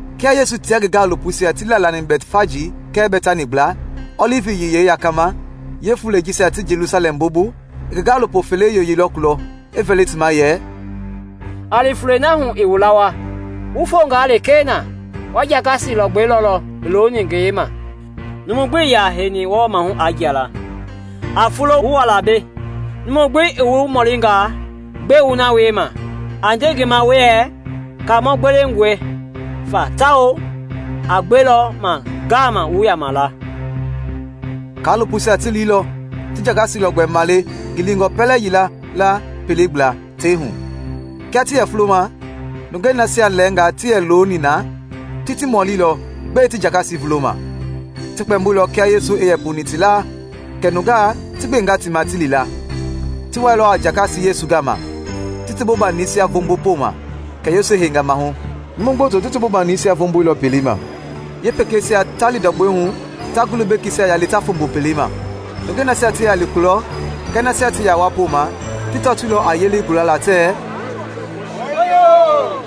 Kia Yesu tia ngi gaalopoisia ti laalani Bɛtfaji kɛɛ Bɛtani gbla, Ɔlivi Yiyei yakama, yeefulei jisia ti Jelusalɛm bobu, i ngi gaalopo fele yoyeilɔ kulɔ, i vɛli ti ma yɛ, “A li fulei na hu i wu lawaa, wu fonga lekee na, wa jakasi lɔgbɛ lɔlɔ i looni ngeyei ma, numu gbi ii ya heini lɛ wɔɔ mahu aa jia la. A fulo wu wa la mbei. Numu gbi i wu mɔlinga gbɛe wu na wiema, a nde ngi ma wuɛɛ Kaamɔi gbewengɔe fa tawao a gbelɔ ma ngama wu yama la.” Kaalopoisia ti liilɔ ti jakasi lɔgbɛi male ngilingɔ pɛlɛ yila la pelei gbla, tei hu. Kia ti yɛ fuloma, nungei nasia lɛɛngaa ti yɛ looni na ti ti mɔlilɔ gbɛe ti jakasi vuloma. Ti kpɛmboilɔ kia Yesu i yɛ puni ti laa kɛ nungaa ti gbenga ti ma ti li la. Ti wailɔ a jakasi Yesu gama, ti ti bobanisia vombo poma, kɛ Yesu i heinga mahu. Numu gboto ti ti bobanisia vomboilɔ pelei ma, yeepekeisia ta li ndɔgbɔi hu ta ngulu bekeisia yali ta fombo pelei ma. Nungei nasia ti yɛ li kulɔ kɛɛ nasia ti yɛ wa poma ti tɔtoilɔ a yelei gulala tɛɛ, “Hooyoo!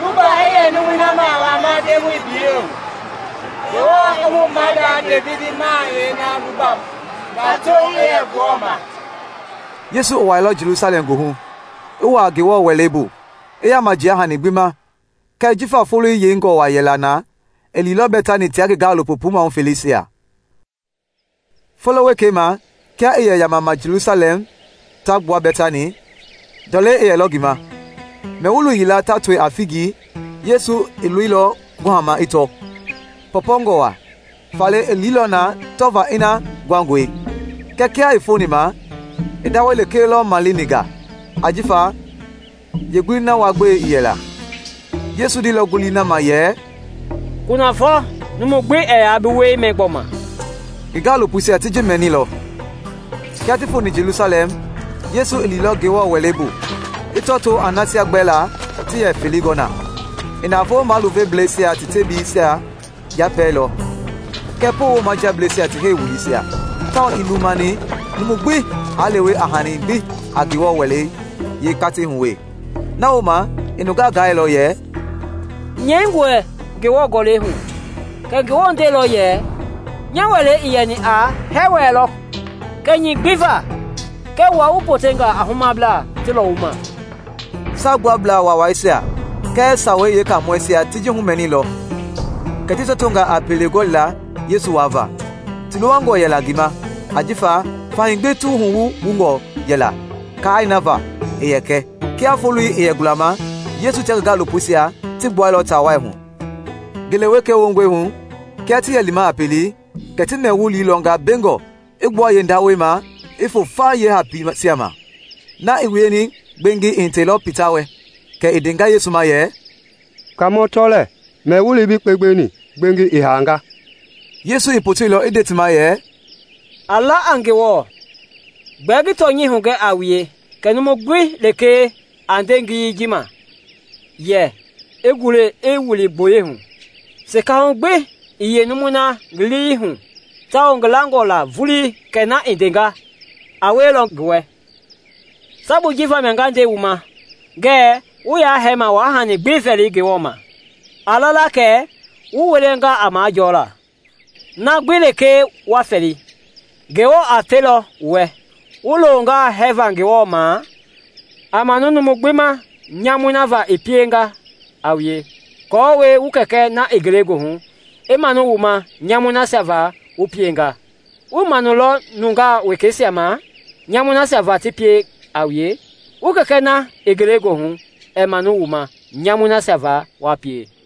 Luba i yɛ numui na ma i wama Ndemɔi biyei hu! Ngewɔ i mu maada Devidi mahayɛi na luba i wama! Tato i yɛ Ngewɔ ma!” Yesu i wuailɔ Jelusalɛm goohu, i wua Ngewɔ Wɛlei bu, i yaama jia hani gbi ma; kɛɛ jifa foloi yeingɔ wa yɛla na, i liilɔ Bɛtani tia ngi gaalopo puu maahu feleisia. Folo wekei ma kia ti yɛ yamama Jelusalɛm ta gbua Bɛtani, ndɔlei i yɛlɔ ngi ma. Mɛ-wulu yila ta toi a figi, Yesu i loilɔ kuhama i tɔ, pɔpɔngɔ wa; faale i liilɔ na tɔva ina nguangɔe. Kɛɛ kia i foni ma, i ndawɛi lekee lɔ maleni nga, ajifa yeengulii na wua-gbelei ii yɛla. Yesu ndeilɔ ngulii na ma yɛ, “Kunafɔ numu gbi ɛɛ yaa bi wuɛi mɛ gbɔma!” Ngi gaalopoisia ti ji mɛnilɔ. Kia ti foni Jelusalɛm, Yesu i liilɔ Ngewɔ Wɛlei bu, i tɔtoo a nasia gbɛlaa ti yɛ felei gɔ na. I navoo maluvebleisia ti tebiisia yapɛɛilɔ kɛɛ poowo majiableisia ti heiwuliisia, tawao ii lumani numu gbi aa lewe a hani gbi a Ngewɔ Wɛlei yeekatei hu wee. Na wooma i nungaa gailɔ yɛ, “Nyɛingɔe Ngewɔ Gɔlɛi hu kɛ Ngewɔ ndeilɔ yɛ, ‘Nya Wɛlei i yɛni a hɛɛ-wɛlɛ lɔ kɛnyɛi gbi va.’ Kɛɛ wua wu potenga a humablaa ti lɔwuma!” Saagbuablaa Waawaisia kɛɛ Sawei Yeekaamɔisia ti ji humɛniilɔ kɛ ti tɔtonga a pele gɔlila Yesu wava. Ti luwangɔ yɛla ngi ma ajifa fahii gbi ti wuhu wungɔ yɛla kai na va i yɛ kɛ. Kia foloi i yɛ gulama, Yesu tia ngi gaalopoisia ti gbuɛilɔ taa wai hu. Ngele wekei wongɔi hu, kia ti yɛ lima a pelei, kɛ ti mɛ-wulii lɔnga mbengɔ i gbua yeendawɛisia ma i foo fa yeehapiisia ma. Na i wieni gbengi i hitɛilɔ Pita wɛ, kɛ i ndenga Yesu ma yɛ, “Kaamɔ, tɔ lɛɛ, mɛ-wulii bi kpengbeni gbengi i haanga!” Yesu i poteilɔ i nde ti ma yɛ, “A la a Ngewɔ. Gbɛɛ ngi tɔnyɛi hugɛ a wue kɛ numu gbi lekee a nde ngiyei ji ma yɛ i gule i wili gboyei hu, sekahu gbi ii yeenumui na lii hu tawao ngi langɔ la vulii kɛ na i ndenga a wielɔ, a wielɔ ngi wɛ. Sabui ji vamia nga nde wu ma ngɛɛ wu ya hɛɛma wa hani gbi vɛli Ngewɔ ma, a lala kɛ wu wilanga a majɔla, na gbi lekee wa fɛli, Ngewɔ a felɔ wu wɛ. Wu loonga hɛɛva Ngewɔ ma, a manu numu gbi ma nyamui na va i pienga a wue, aako wu Kɛkɛ na i ngelegoohu i manu wu ma nyamui nasia va wu pienga. [ Wuii manuilɔ nungaa wekeisia ma nyamui nasia va ta pie a wue, wu Kɛkɛ na i ngelegoohu ɛɛ manu wu ma nyamui nasia va wa pie.]”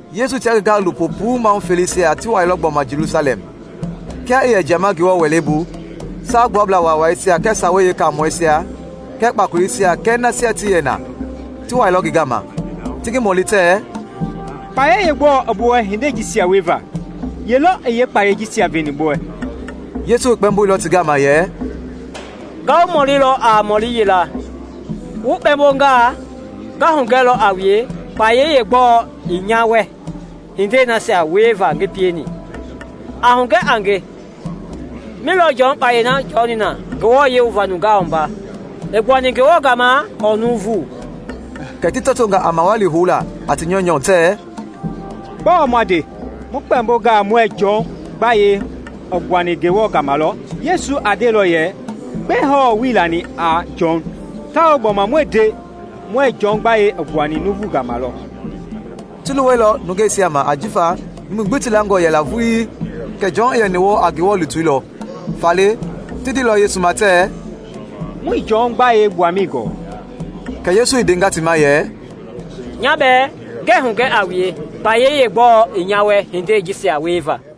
Yesu tia ngi gaalopo puu maahu feleisia ti wailɔ gbɔma Jelusalɛm. Kia i yɛ jiama Ngewɔ Wɛlei bu, Saagbuablaa Waawaisia kɛɛ Sawei Yeekaamɔisia kɛɛ kpakoleisia kɛɛ nasia ti yɛ na ti wailɔ ngi gama, ti ngi mɔli tɛɛ, “Kpayei yeegbɔɔ i bi wɛ hindei jisia wieva? Ye lɔ i yeekpayei ji veni bi wɛ?” Yesu i kpɛmboilɔ ti gama yɛ, “Nga wu mɔlilɔ a mɔli yila; wu kpɛɛmbongaa, nga hugɛlɔ a wue kpayei yeegbɔɔ i nya wɛ hindei nasia wieva ngi pieni. A hugɛ a nge, mindo lɔ Jɔn i kpayei na jɔni na nungaa wuava; i gbuani Ngewɔ gama lɔ ɔɔ nuuvu?” Kɛ ti tɔtonga a mawali houla a ti nyɔunyɔ tɛɛ, “Gbɔɔ ma nde? Mu kpɛmbongaa muɛɛ Jɔn gbayei i gbuani Ngewɔ gama lɔ, Yesu a ndelɔ yɛ gbɛe hɔɔ wuii lani a Jɔn? Tawao gbulama mu nde muɛɛ Jɔn gbayei i gbuani nuuvu gama lɔ.” (Ti luwɛilɔ nungeisia ma ajifa numui gbi ti langɔ yɛla vulii kɛ Jɔn i yɛni wɔɔ a Ngewɔ lutui lɔ.) Faale ti ndeilɔ Yesu ma tɛɛ, “Muii Jɔn gbayei gbuamɛi gɔɔ.” Kɛ Yesu i ndenga ti ma yɛ, “Nya bɛɛ ngɛɛ hugɛ a wue kpayei yeegbɔɔ i nya wɛ hindei jisia wieva.”